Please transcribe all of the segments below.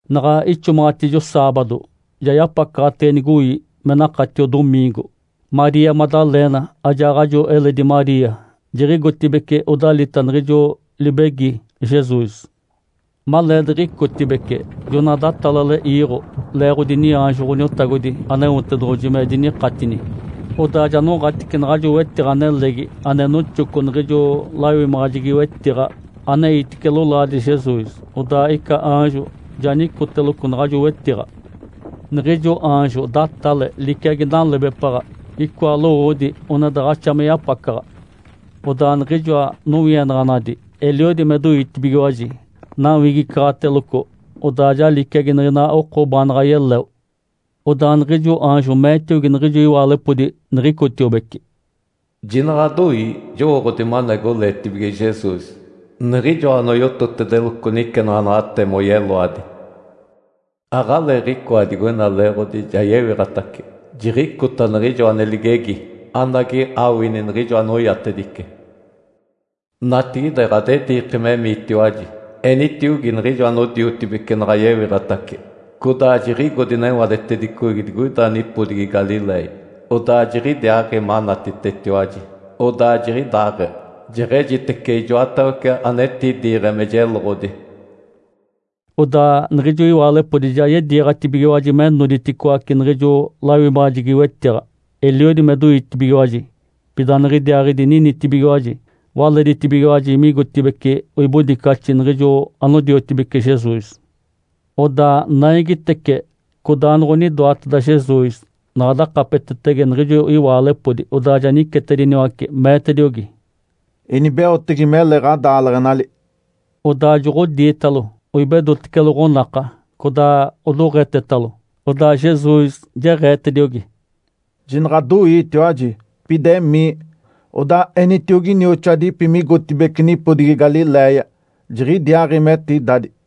Naɡ̶a ixomaɡ̶atijo saabado, ja yapacaɡ̶atege nigoi me nakatio domiingo, Maria Madalena ajaaɡ̶ajo eledi Maria jiɡ̶igotibeci odalita niɡ̶ijo libegi Jesus. Maleediɡ̶icotibeci, jonaɡ̶a datalale iiɡ̶o, leeɡ̶odi niaanjo Ǥoniotagodi Aneotedoɡ̶oji me dinikatini, odaa ja noɡ̶atice naɡ̶ajo wetiɡ̶a nelegi ane noxoco niɡ̶ijo lawimaɡ̶ajegi-wetiɡ̶a aneitice lolaadi Jesus, odaa ica aanjo ja nicoteloco naɡ̶ajo wetiɡ̶a. Niɡ̶ijo aanjo datale liciagi nalebepaɡ̶a, icoa lowoodi one daɡ̶axa me yapacaɡ̶a. Odaa niɡ̶ijoa nowienaɡ̶anadi eliodi me doitibigiwaji, nawigicaɡ̶ateloco, odaa ja liciagi niɡ̶ina oko baanaɡ̶a yeleo. Odaa niɡ̶ijo aanjo meetiogi niɡ̶ijo iwaalepodi, niɡ̶icotiobeci, “Jinaɡ̶adoii! Jowooɡ̶odi managi oleetibige Jesus, niɡ̶ijoa anoyototedeloco nicenaɡ̶anaɡ̶ate moyeloadi. Aɡ̶aleeɡ̶icoa digoina, leeɡ̶odi ja yewiɡ̶atace, jiɡ̶icota niɡ̶ijo ane ligegi. Anagi, awini niɡ̶ijo anoyatedice. Natigide ɡ̶adediiki memiitiwaji, enitiogi niɡ̶ijo anodiotibece naɡ̶a yewiɡ̶atace, codaa jiɡ̶igo dinewadetedicogi digoida nipodigi Galiléia. Odaa jiɡ̶idiaaɡ̶i manatitetiwaji. Odaa jiɡ̶idaaɡ̶ee, jeɡ̶ejitece ijoatawece anetidiiɡ̶e me jeloɡ̶odi.” Odaa niɡ̶ijo iwaalepodi ja yediiɡ̶atibigiwaji me noditicoaci niɡ̶ijo lawimaɡ̶ajegi-wetiɡ̶a, eliodi me doitibigiwaji, pida niɡ̶idiaaɡ̶idi ninitibigiwaji. Waleditibigiwaji migotibeci oibodicaxi niɡ̶ijo anodiotibece Jesus. Odaa naigitece codaa noɡ̶onidoateda Jesus naɡ̶a dakapetetege niɡ̶ijo iwaalepodi, odaa ja nicetediniwace, meetediogi, “Inibeotege mele ɡ̶adaaleɡ̶enali!” Odaa joɡ̶odiitalo, oibedotece loɡ̶onaka, codaa odoɡ̶etetalo. Odaa Jesus jeɡ̶eetediogi, “Jinaɡ̶a adoiitiwaji! Pida emii, odaa enitiogi inioxoadipi migotibeci nipodigi Galiléia. Jiɡ̶idiaaɡ̶i metidadi.”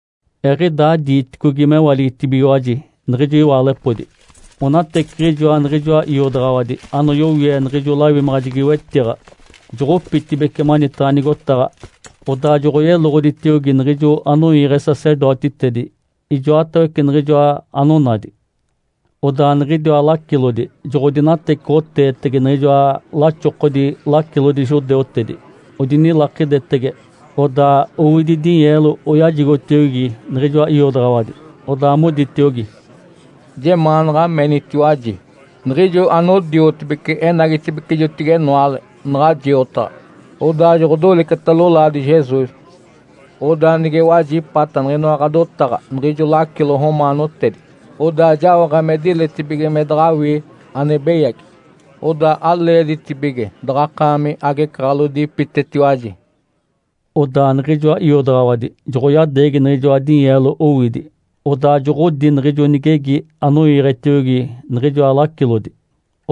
Eɡ̶idaa diiticogi mewaligitibigiwaji niɡ̶ijo iwaalepodi, onateciɡ̶ijoa niɡ̶ijoa iodaɡ̶awadi anoyowie niɡ̶ijo lawimaɡ̶ajegi-wetiɡ̶a joɡ̶opitibeci manitaɡ̶a nigotaɡ̶a. Odaa joɡ̶oyeloɡ̶oditiogi niɡ̶ijo anoiiɡ̶e sacerdotitedi ijoatawece niɡ̶ijoa anonadi. Odaa niɡ̶idiwa lacilodi joɡ̶odinatecoɡ̶oteetege niɡ̶ijoa laxokodi lacilodi judeutedi, odinilakidetege. Odaa owidi dinyeelo oyajigotiogi niɡ̶ijoa iodaɡ̶awadi. Odaa moditiogi, “Jemaanaɡ̶a menitiwaji, ‘Niɡ̶ijo anodiotibece enagitibeci jotigenoale naɡ̶a jiotaɡ̶a. Odaa joɡ̶odoliceta lolaadi Jesus.’ Odaa nige wajipata niɡ̶inoa ɡ̶adotaɡ̶a niɡ̶ijo lacilo romaanotedi, odaa jaoɡ̶a me diletibige me daɡ̶awii ane beyagi, odaa aleeditibige daɡ̶akaami agecaɡ̶alodipitetiwaji.” Odaa niɡ̶ijoa iodaɡ̶awadi joɡ̶oyadeegi niɡ̶ijoa dinyeelo owidi, odaa joɡ̶odi niɡ̶ijo nigegi anoiiɡ̶etiogi niɡ̶ijoa lacilodi.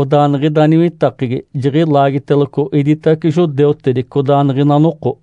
Odaa niɡ̶ida niwitakegi jiɡ̶ilaagiteloco iditawece judeutedi codaa niɡ̶ina noko.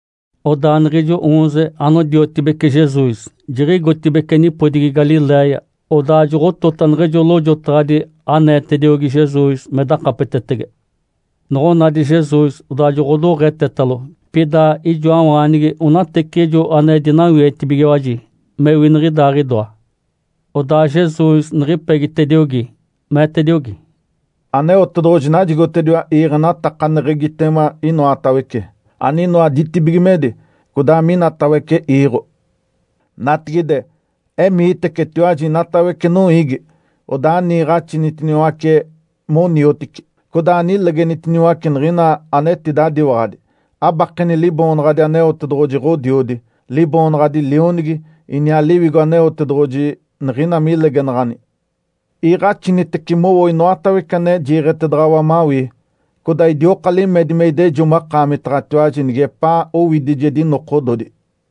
Odaa niɡ̶ijo oonze anodiotibece Jesus jiɡ̶igotibeci nipodigi Galiléia, odaa joɡ̶otota niɡ̶ijo lojotaɡ̶adi aneetediogi Jesus me dakapetetege. Noɡ̶onadi Jesus, odaa joɡ̶odoɡ̶etetalo. Pida ijoawaanigi onateciɡ̶ijo ane dinawietibigiwaji mewi niɡ̶idaaɡ̶idoa. Odaa Jesus niɡ̶ipegitediogi, meetediogi, “Aneotedoɡ̶oji najigotediwa iiɡ̶enatakaneɡ̶egitema inoatawece, aninoa ditibigimedi codaa minatawece iiɡ̶o. Natigide, emiitecetiwaji inatawece noiigi, odaa aniiɡ̶axinitiniwace moniotici, codaa anilegenitiniwace niɡ̶ina anetidadiwaɡ̶adi. Abakeni Liboonaɡ̶adi Aneotedoɡ̶oji Ǥodiodi, Liboonaɡ̶adi Lionigi, iniaa Liwigo Aneotedoɡ̶oji niɡ̶ina milegenaɡ̶ani. Iiɡ̶axinitece mowo inoatawece ane jiiɡ̶etedaɡ̶awa mawii. Codaa idioka limedi me idejo makaamitaɡ̶atiwaji nigepaa owidijedi nokododi.”